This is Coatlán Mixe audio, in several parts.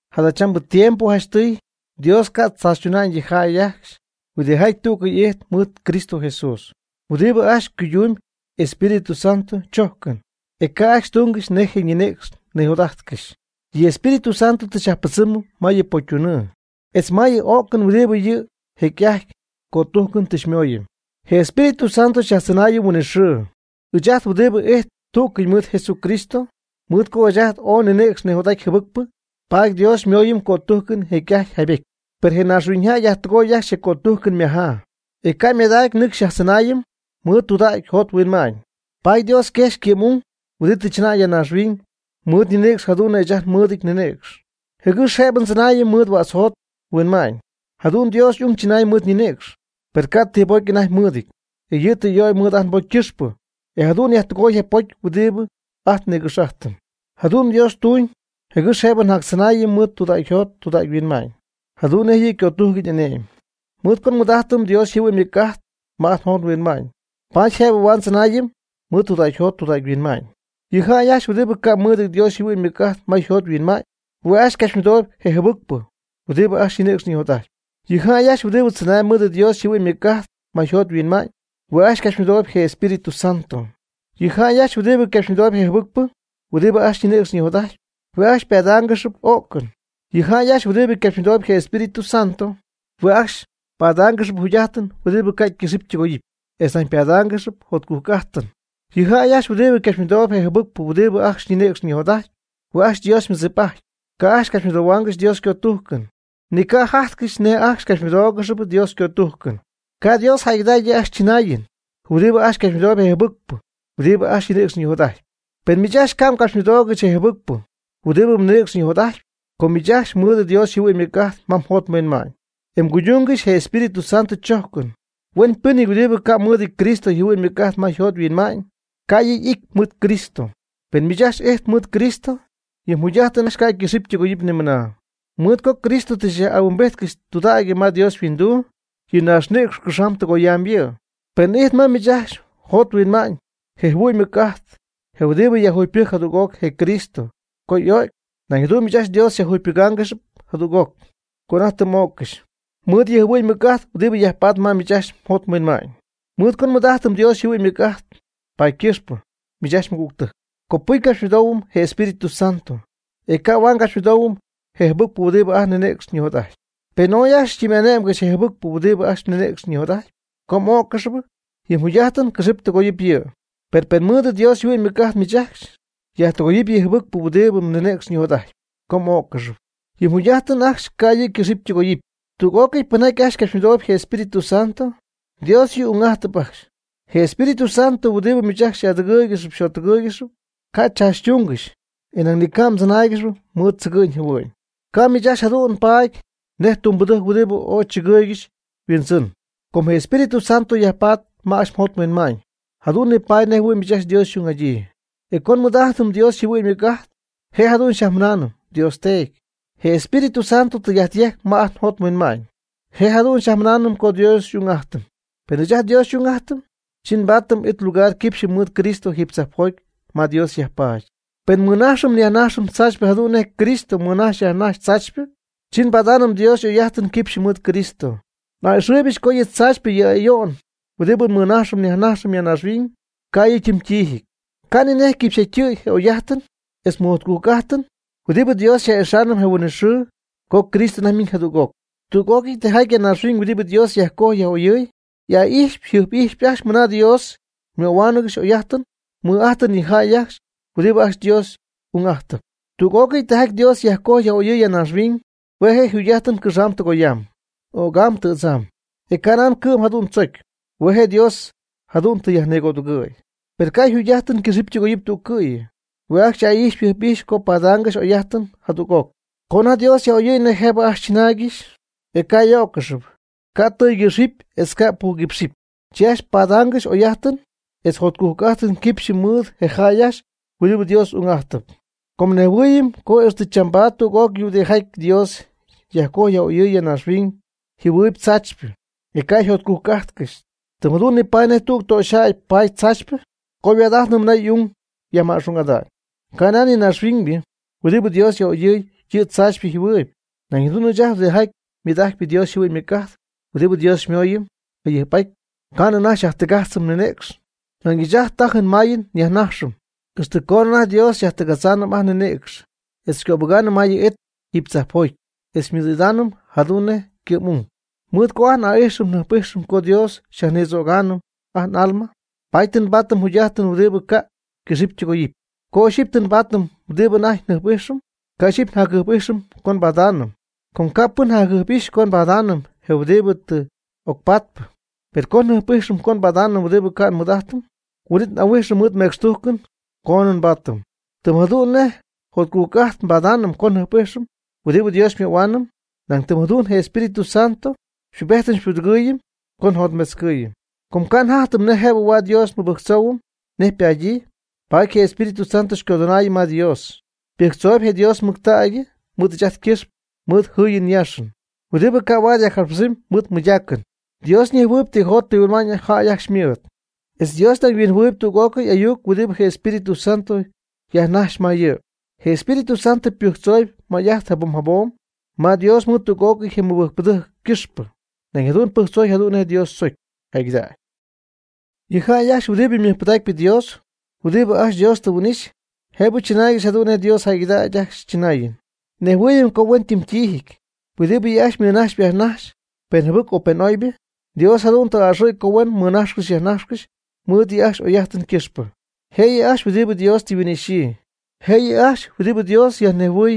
Jadachambɨ tiempo janchtɨy Dios ca' tzaachytuna'ñ yɨ jäy ajcxy huɨdijaty tú'cɨy ijtp mɨɨd Cristo Jesús, huɨdibɨ ajcxy cuydumb Espíritu Santo chojcɨn, e ca' ajcxy tungɨxy nej je ninïcx nijot'ajtcɨxy. Je Espíritu Santo tɨ xyyajpɨdzɨmɨm ma yɨ pocytunɨɨ etz ma yɨ o'cɨn huɨdibɨ yɨ jecy'ajty cötujcɨn tɨ xymooyɨm. Je Espíritu Santo xyajtzɨnaayɨm huinɨxɨɨ, ɨɨch ajt huɨdibɨ ijtp tú'cɨy mɨɨd Jesucristo. Mɨɨd co ɨɨch ajt ooy ninïcx ñijot'aty jɨbɨcpɨ, paady Dios xymooyɨm ycötujcɨn jecy'ajty jaybety. Per je naaxhuiñyjäy yajtɨgoy ajcxy je cötujcɨn ymajaa, e ca' ymadacy nɨcxy xyajtzɨnaayɨm mɨɨd tudägy jot huinma'ñ. Paady Dios yquejxy ycɨ'm'ung huidi tɨ chɨnäy ya naaxhuiñ mɨɨd ñinïcx jadu'n nej ɨɨch ajt nmɨɨdɨty nninïcx, jɨgɨx jëbɨ ndzɨnaayɨm mɨɨd huädz jot huinma'ñ. Jadu'n Dios y'ung chɨnay mɨɨd ñinïcx, per ca' ni ti bocy anajty mɨɨdɨty. E yɨ' tɨ y'ögy mɨɨd ajt nbocy ycɨxpɨ, e jadu'n yajtɨgoy je pocy huɨdibɨ ajt nïgɨx'ajtɨm. Jadu'n Dios ytuuñ jɨgɨx jëbɨ xyajtzɨnaayɨm mɨɨd tudägyjot tudägyhuinma'ñ jadu'n nej yɨ' ycötujcɨn y'ane'my. Mɨɨd co nmɨɨd'ajtɨm Dios yjɨhuɨ'ñ ymɨc'ajt ma ajt njot nhuinma'ñ, paady jëbɨ huaad ndzɨnaayɨm mɨɨd tudägy-jot tudägy-huinma'ñ. Yɨ jäy ajcxy huɨdibɨ ca' mɨɨdɨty Dios yjɨhuɨ'ñ ymɨc'ajt ma yjot yhuinma'ñ, hue' ajcxy ycapxymɨdooyb je jɨbɨcpɨ huɨdibɨ ajcxy ñinïcx ñijot'ajtpy. Yɨ jäy ajcxy huɨdibɨ tzɨnaayb mɨɨd Dios yjɨhuɨ'n ymɨc'ajt ma yjot yhuinma'ñ, hue' ajcxy ycapxymɨdooyb je Espíritu Santo. Yɨ jäy ajcxy huɨdibɨ capxymɨdoob je jɨbɨcpɨ huɨdibɨ ajcxy ñinïcx ñijot'ajtpy, hue' ajcxy ypadaangɨxyp o'cɨn. Yɨ jäy ajcxy huɨdibɨ capxymɨdoob je Espíritu Santo, hue' ajcxy ypadaangɨxyp jugy'ajtɨn huɨdibɨ ca' ycɨxɨpy ytɨgoyɨpy, etz nañ ypadaangɨxyp jotcujc'ajtɨn. Yɨ jäy ajcxy huɨdibɨ capxymɨdoob je jɨbɨcpɨ huɨdibɨ ajcxy ñinïcx ñijot'ajtpy, hue' ajcxy Dios ymɨdzip'ajtpy, ca' capxymɨdohuaangɨxy Dios ycötujcɨn. Ni ca' jajtcɨxy nej ajcxy capxymɨdóogɨxɨpy Dios ycötujcɨn. Ca' Dios jäygɨdägy yɨ' ajcxy chɨnaayɨn huɨdibɨ ajcxy capxymɨdoob je jɨbɨcpɨ huɨdibɨ ajcxy ñinïcx ñijot'ajtpy. Per miich ajcxy ca' mgapxymɨdoogɨxy je jɨbɨcpɨ huɨdibɨ mninïcx nijot'ajtpy. Com miich ajcxy mmɨɨd Dios yjɨhuɨ'ñ ymɨc'ajt ma mjot mhuinma'ñ, e mguydungɨxpy je Espíritu Santo chojcɨn. Huenpɨnɨty huɨdibɨ ca' mɨɨdɨty Cristo yjɨhuɨ'ñ ymɨc'ajt ma yjot yhuinma'ñ, ca' yɨ' y'ity mɨɨd Cristo. Pen miich ajcxy ijtp mɨɨd Cristo, yɨ mjugy'ajtɨn ajcxy ca' ycɨxɨpy ytɨgoyɨpy nimɨna, mɨɨd co Cristo tɨ xyaj'ahuimbijtcɨxy tudägy ma Dios yhuinduu. Yɨ mnaaxnïcx cɨxamb tɨgoyamb yɨ'. Pen ijtp ma miich ajcxy mjot mhuinma'ñ je' yjɨhuɨ'ñ ymɨc'ajt je huɨdibɨ yajjugypɨjc jadüg'oc je Cristo co y'o'cy. Nañ jadu'n miich ajcxy Dios xyajjugypɨgaangɨxy jadüg'oc, co anajty tɨ m'öccɨxy, mɨɨd yɨ' yjɨhuɨ'ñ ymɨc'ajt huidi yajpaatp ma miich ajcxy mjot mhuinma'ñ. Mɨɨd co nmɨɨd'ajtɨm Dios yjɨhuɨ'ñ ymɨc'ajt paady ycɨxpɨ, miich ajcxy mɨgügtɨjc, copɨcy ngapxymɨdoohuɨm je Espíritu Santo, e ca' huaad ngapxymɨdoohuɨm je jɨbɨcpɨ huɨdibɨ ajt nninïcx ñijot'ajtpy. Pen ooy ajcxy xytɨmy'ane'mgɨxy je jɨbɨcpɨ huɨdibɨ ajcxy mninïcx ñijot'ajtyp, co m'öccɨxɨpy, yɨ mjugy'ajtɨn cɨxɨp tɨgoyɨp yɨ'. Per pen mɨɨd Dios yjɨhuɨ'ñ ymɨc'ajt miich ajcxy myajtɨgoy je jɨbɨcpɨ huɨdibɨ mninïcx ñijot'ajtpy, co m'öccɨxɨpy, yɨ mjugy'ajtɨn ajcxy ca' yɨ' ycɨxɨpy ytɨgoyɨpy. Tüg'ócɨy pɨnjaty ajcxy capxymɨdoob je Espíritu Santo, Dios yɨ' ung'ajtɨp ajcxy. Je Espíritu Santo huɨdibɨ miich ajcxy xy'adɨgɨɨygɨxp xyjottɨgɨɨygɨxp, ca' xychaachytungɨxy e nañ ni ca' mdzɨnähuaangɨxy mɨɨd tzɨgɨ'ñ jɨhuɨ'ñ. Ca' miich ajcxy jadu'n paady nej tumbɨdɨjc huɨdibɨ ooy tzɨgɨɨygɨxy yhuindzɨn. Co je Espíritu Santo yajpaady ma ajcxy mjot mhuinma'ñ, jadu'n nipaady nejɨhuɨ̈y miich ajcxy Dios xy'ung'adyii. E com nmɨɨd'ajtɨm Dios yjɨhuɨ'ñ ymɨc'ajt, je' jadu'n xyajmɨnaanɨm: “¡Dios Teedy!” Je Espíritu Santo tɨy'ajt yejcp ma ajt njot nhuinma'ñ, je' jadu'n xyajmɨnaanɨm co Dios xy'ung'ajtɨm. Pen ɨɨch ajt Dios xy'ung'ajtɨm, chi nbadaanɨm it lugar quipxyɨ mɨɨd Cristo jiiby tzajpjoty ma Dios yajpaady. Pen nmɨnajxɨm nyajnajxɨm tzaachypɨ jadu'n nej Cristo mɨnajxy yajnajxy tzaachypɨ, chi nbadaanɨm Dios y'oy'ajtɨn quipxyɨ mɨɨd Cristo. N'a'ɨxɨɨybɨch co yɨ tzaachypɨ yɨ ayo'n huɨdibɨ nmɨnajxɨm nyajnajxɨm ya naaxhuiñ, ca' yɨ' ytim ytiijɨty, ca' ninej yquipxyjatytɨ̈y je oy'ajtɨn etz mɨjjotcujc'ajtɨn huɨdibɨ Dios xyaj'ixaanɨm je huin'it xɨɨ co Cristo anajty ymiñ jadüg'oc. Tüg'ócɨy tijaty ya naaxhuiñ huɨdibɨ Dios tɨ yajcojy yaj'oyɨ̈y, y'aa'ijxpy yjɨjp'ijxpy ajcxy mɨna Dios ymöhuáanɨgɨxy y'oy'ajtɨn ymɨj'ajtɨn yɨ jäy ajcxy huɨdibɨ ajcxy Dios ung'ajtɨp. Tüg'ócɨy tijaty Dios tɨ yajcojy yaj'oyɨ̈y ya naaxhuiñ, hue' je' yjugy'ajtɨn cɨxamb tɨgoyamb, ögam tɨ̈dzam. E canan cɨ'm jadu'n tzocy, hue' je' Dios jadu'n tɨ yajnigödugɨ̈y. Per ca' yjugy'ajtɨn ycɨxɨpy ytɨgoyɨpy tu'cɨ̈yɨ hue' ajcxy y'aa'ijxpy yjɨjp'ijxpy co padaangɨxy oy'ajtɨn jadüg'oc. Co anajty Dios yaj'oyɨ̈y nej jëbɨ ajcxy chɨnaaygɨxy, e ca' y'öccɨxɨpy, ca' ytɨ́ɨtzcɨxɨpy, etz ca' ypügɨxɨpy, chi ajcxy padaangɨxy oy'ajtɨn etz jotcujc'ajtɨn quipxyɨ mɨɨd je jäy ajcxy huɨdibɨ Dios ung'ajtɨp. Com nejhuɨɨyɨm co ixtɨ chambaad tüg'ócɨy huɨdijaty Dios yajcojy yaj'oyɨɨy ya naaxhuiñ yjɨhuɨɨyb tzaachypɨ, e ca' yjotcujc'ajtcɨxy. Tɨm jadu'n nipaady nej tüg töxyjäy paady tzaachypɨ co yhuaad'ajtnɨ mɨna y'ung yajma'xung'ada'ñ. Canan yɨ naaxhuiñybɨ huɨdi Dios yaj'oyɨɨy yɨ'yɨ tzaachypɨ jɨhuɨɨyb, nañ jadu'n ɨɨch ajt huɨdijaty mɨɨd'ajtp Dios yjɨhuɨ'ñ ymɨc'ajt, huɨdibɨ Dios xymooyɨm jayɨjp'aty ca'nɨ anajty nyajtɨgajtzɨm nninïcx. Nañ ɨɨch ajt tajɨm mayɨm njɨ́ɨyɨm nyaaxɨm ixtɨ coonɨ anajty Dios xyajtɨgadzaanɨm ajt nninïcx etz xycöbɨgaanɨm ma yɨ' y'it jiiby tzajpjoty, e xymɨɨd'idaanɨm ajt jadu'n nej ycɨ'm'ung. Mɨɨd co n'aa'ijxɨm njɨjp'ijxɨm co Dios xyajnïdzögaanɨm ajt n'alma, paady tɨ nbaatɨm jugy'ajtɨn huɨdibɨ ca' ycɨxɨpy ytɨgoyɨpy. Co ixyipy tɨ nbaatɨm huɨdibɨ anajty njɨjp'ijxɨm, ca' ixyipy njacjɨjp'ijxɨm co nbadáanɨmnɨ. Com ca' pɨn jacjɨjp'ijxnɨ co padaanɨp je huɨdibɨ tɨ ocpatpɨ. Per co njɨjp'íjxɨm co nbadaanɨm huɨdibɨ ca' nmɨɨd'ajtɨm, huin'it n'ahuijxɨm mɨɨd mecxtujcɨn coonɨ nbaatɨm. Tɨm jadu'n nej jotcujc'ajtɨn nbadaanɨm co njɨjp'ijxɨm huɨdibɨ Dios xymöhuaanɨm, nañ tɨm jadu'n je Espíritu Santo xypubejtɨm xypudɨgɨɨyɨm co njotmetzcɨɨyɨm, com ca' njajtɨm nej jëbɨ huaad Dios nmɨbɨjctzoohuɨm nej ypadyii. Paady je Espíritu Santo xycodɨnaayɨm ma Dios, ymɨbɨjctzooyb je Dios mɨctägy mɨɨd ɨɨch ajt ycɨxpɨ mɨɨd jɨɨyɨn yaaxɨn, huɨdi ca' huaad yajcapxpɨdzɨmy mɨɨd mɨydacɨn. Dios ñejhuɨɨyb ti jot ti huinma'ñ jäy ajcxy ymɨɨd. E Dios nañ huinjɨhuɨɨyb tüg'ócɨy ayuc huɨdibɨ je Espíritu Santo yajnajxyp ma yɨ'. Je Espíritu Santo ypɨjctzooyb may'ajt jabom jabom ma Dios mɨɨd tüg'ócɨy je mɨbɨjcpɨdɨjc ycɨxpɨ. Nañ jadu'n pɨjctzoy jadu'n nej Dios tzocy jäygɨdägy. Yɨ jäy ajcxy huɨdibɨ mɨjpɨdacp Dios, huɨdibɨ ajcxy Dios tɨ huin'ixy, jëbɨ chɨnaaygɨxy jadu'n nej Dios jäygɨdägy ajcxy chɨnaayɨn. Nejhuɨɨyɨm co huentɨmtiijɨty huɨdibɨ yɨ' ajcxy ymɨnajxpy yajnajxpy, pen jɨbɨcpɨ o pen oybɨ, Dios jadu'n tɨ a'ɨxɨ̈y co huen mɨnajxcɨxy yajnajxcɨxy mɨɨd yɨ' ajcxy y'oy'ajtɨn ycɨxpɨ. Je' yɨ' ajcxy huɨdibɨ Dios tɨ yhuin'ixyii, je' yɨ' ajcxy huɨdibɨ Dios ñejhuɨɨy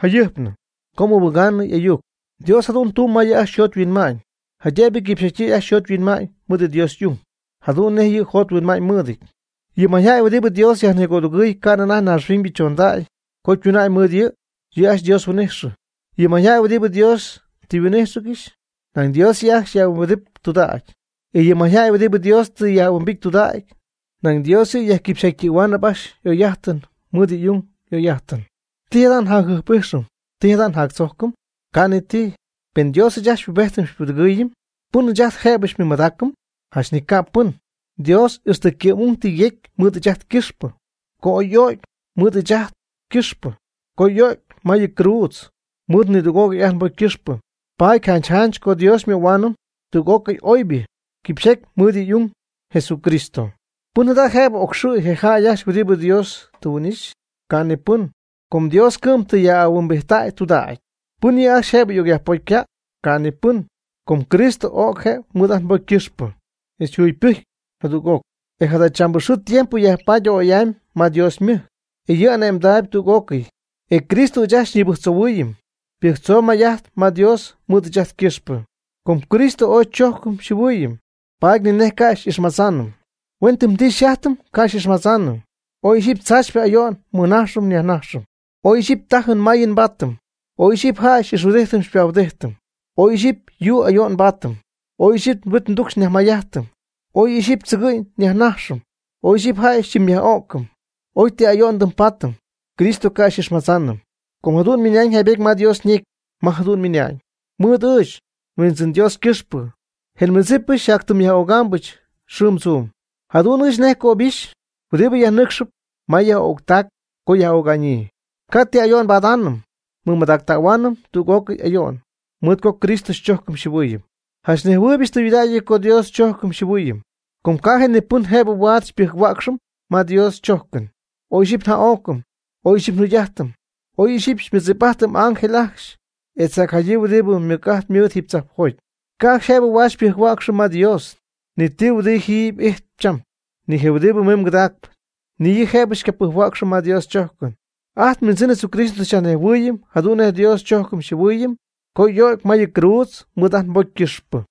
jayɨjpnɨ co ymɨbɨga'ñyii y'ayuc. Dios jadu'n tumb ma yɨ' ajcxy yjot yhuinma'ñ jaydëbɨ yquipxyjatytɨ̈y ajcxy yjot yhuinma'ñ mɨɨd Dios y'ung, jadu'n nej yɨ' yjot yhuinma'ñ mɨɨdɨty. Yɨ mayjäy huɨdibɨ Dios yajnigödugɨɨy ca'nɨ anajty naaxhuiñybɨ chondacy co ytuna'ñ mɨɨd yɨ', yɨ' ajcxy Dios huin'ijxɨ. Yɨ mayjäy huɨdibɨ Dios tɨ yhuin'íjxɨgɨxy, nañ Dios yɨ' ajcxy yaj'ahuimbijtɨp tudägy. E yɨ mayjäy huɨdibɨ Dios tɨ yaj'ahuimbity tudägy, nañ Dios yɨ' yajquipxyjatytɨ̈huaanɨp ajcxy y'oy'ajtɨn mɨɨd yɨ' y'ung y'oy'ajtɨn. ¿Ti jada' njacjɨjp'ijxɨm ti jada' njactzojcɨm? Ca' ni ti. Pen Dios ɨɨch ajt xypubejtɨm xypudɨgɨɨyɨm, ¿pɨn ɨɨch ajt jëbɨ xymɨmadaacɨm? Janch ni ca pɨn. Dios ixtɨ ycɨ'm'ung tɨ yecy mɨɨd ɨɨch ajt ycɨxpɨ, co oy y'o'cy mɨɨd ɨɨch ajt ycɨxpɨ, co oy y'o'cy ma yɨ cruudz mɨɨd nidüg'ócɨy ajt nbocy ycɨxpɨ. Paady janch janch co Dios xymöhuaanɨm tüg'ócɨy oybɨ quipxyjaty mɨɨd yɨ' y'ung, Jesucristo. ¿Pɨn jada' jëbɨ ocxɨ̈y je jäy ajcxy huɨdibɨ Dios tɨ huin'ixy? Ca' ni pɨn. Com Dios cɨ'm yɨ' tɨ yaj'ahuimbijttäy tudägy. ¿Pɨn yɨ' ajcxy jëbɨ ocyajpocycäy? Ca' ni pɨn. Com Cristo o'c je' mɨɨd ajt nbocy ycɨxpɨ, etz yjugypɨjcy jadüg'oc, e jadachambɨ xɨɨ tiempo yajpaady a'oy'amy ma Dios ymɨjc, e yɨ' ane'mdaayb tüg'ócɨy. E Cristo ɨɨch ajt xyñibɨjctzohuɨɨyɨm, ypɨjctzooyb may'ajt ma Dios mɨɨd ɨɨch ajt ycɨxpɨ. Com Cristo ooy xychojcɨm xyjɨhuɨɨyɨm, paady ni nej ca' xy'ixmadzaanɨm. Huen ti ndɨmpaatɨm ca' xy'ixmadzaanɨm. Oy ixyipy tzaachypɨ ayo'n nmɨnajxɨm nyajnajxɨm, oy ixyipy tajɨn mayɨn nbaatɨm; oy ixyipy jäy xy'ixhuɨdijtɨm xypahuɨdijtɨm; oy ixyipy yuu ayo'n nbaatɨm; oy ixyipy huit tucxy nyajmayjajtɨm; oy ixyipy tzɨgɨ'ñ nyajnajxɨm; oy ixyipy jäy xytɨmyyaj'o'cɨm. Oy ti ayo'n ndɨmbaatɨm, Cristo ca' xy'ixmadzaanɨm. Com jadu'n ymiñ jaybety ma Dios ñecy ma jadu'n ymɨnañ: Mɨɨd miich, Huindzɨn Dios ycɨxpɨ, je nmɨdzipɨch xyjatytɨmyyaj'ögaambɨch xɨɨm tzuum. Jadu'n ɨɨch ajcxy nej cöbixy huɨdibɨ yajnɨcxɨp ma yaj'öctac co yaj'öga'ñyii. Ca' ti ayo'n nbadaanɨm. Nmɨmadactähuaanɨm tüg'ócɨy ayo'n, mɨɨd co Cristo xychojcɨm xyjɨhuɨɨyɨm. Janch nejhuɨɨybɨch tɨydudägy co Dios xychojcɨm xyjɨhuɨɨyɨm. Ca' ji ni pɨn jëbɨ huaad xypɨjc-huäcxɨm ma Dios chójcɨn, oy ixyipy nja'o'cɨm; oy ixyipy njajugy'ajtɨm; oy ixyipy xymɨdzip'ajtɨm ángel ajcxy etz jacjadyii huɨdibɨ mɨc'ajt mɨɨd jiiby tzajpjoty. Ca' ajcxy jëbɨ huaad xypɨjc-huäcxɨm ma Dios, ni ti huɨdibɨ ji ijtp cham, ni je huɨdibɨ mimb cɨdacp, ni yɨ' jëbɨ xycapɨjc-huäcxɨm ma Dios chojcɨn. Ajt nHuindzɨn Jesucristo tɨ xyajnejhuɨɨyɨm jadu'n nej Dios xchojcɨm xyjɨhuɨɨyɨm co y'o'cy ma yɨ cruudz mɨɨd ajt nbocy ycɨxpɨ.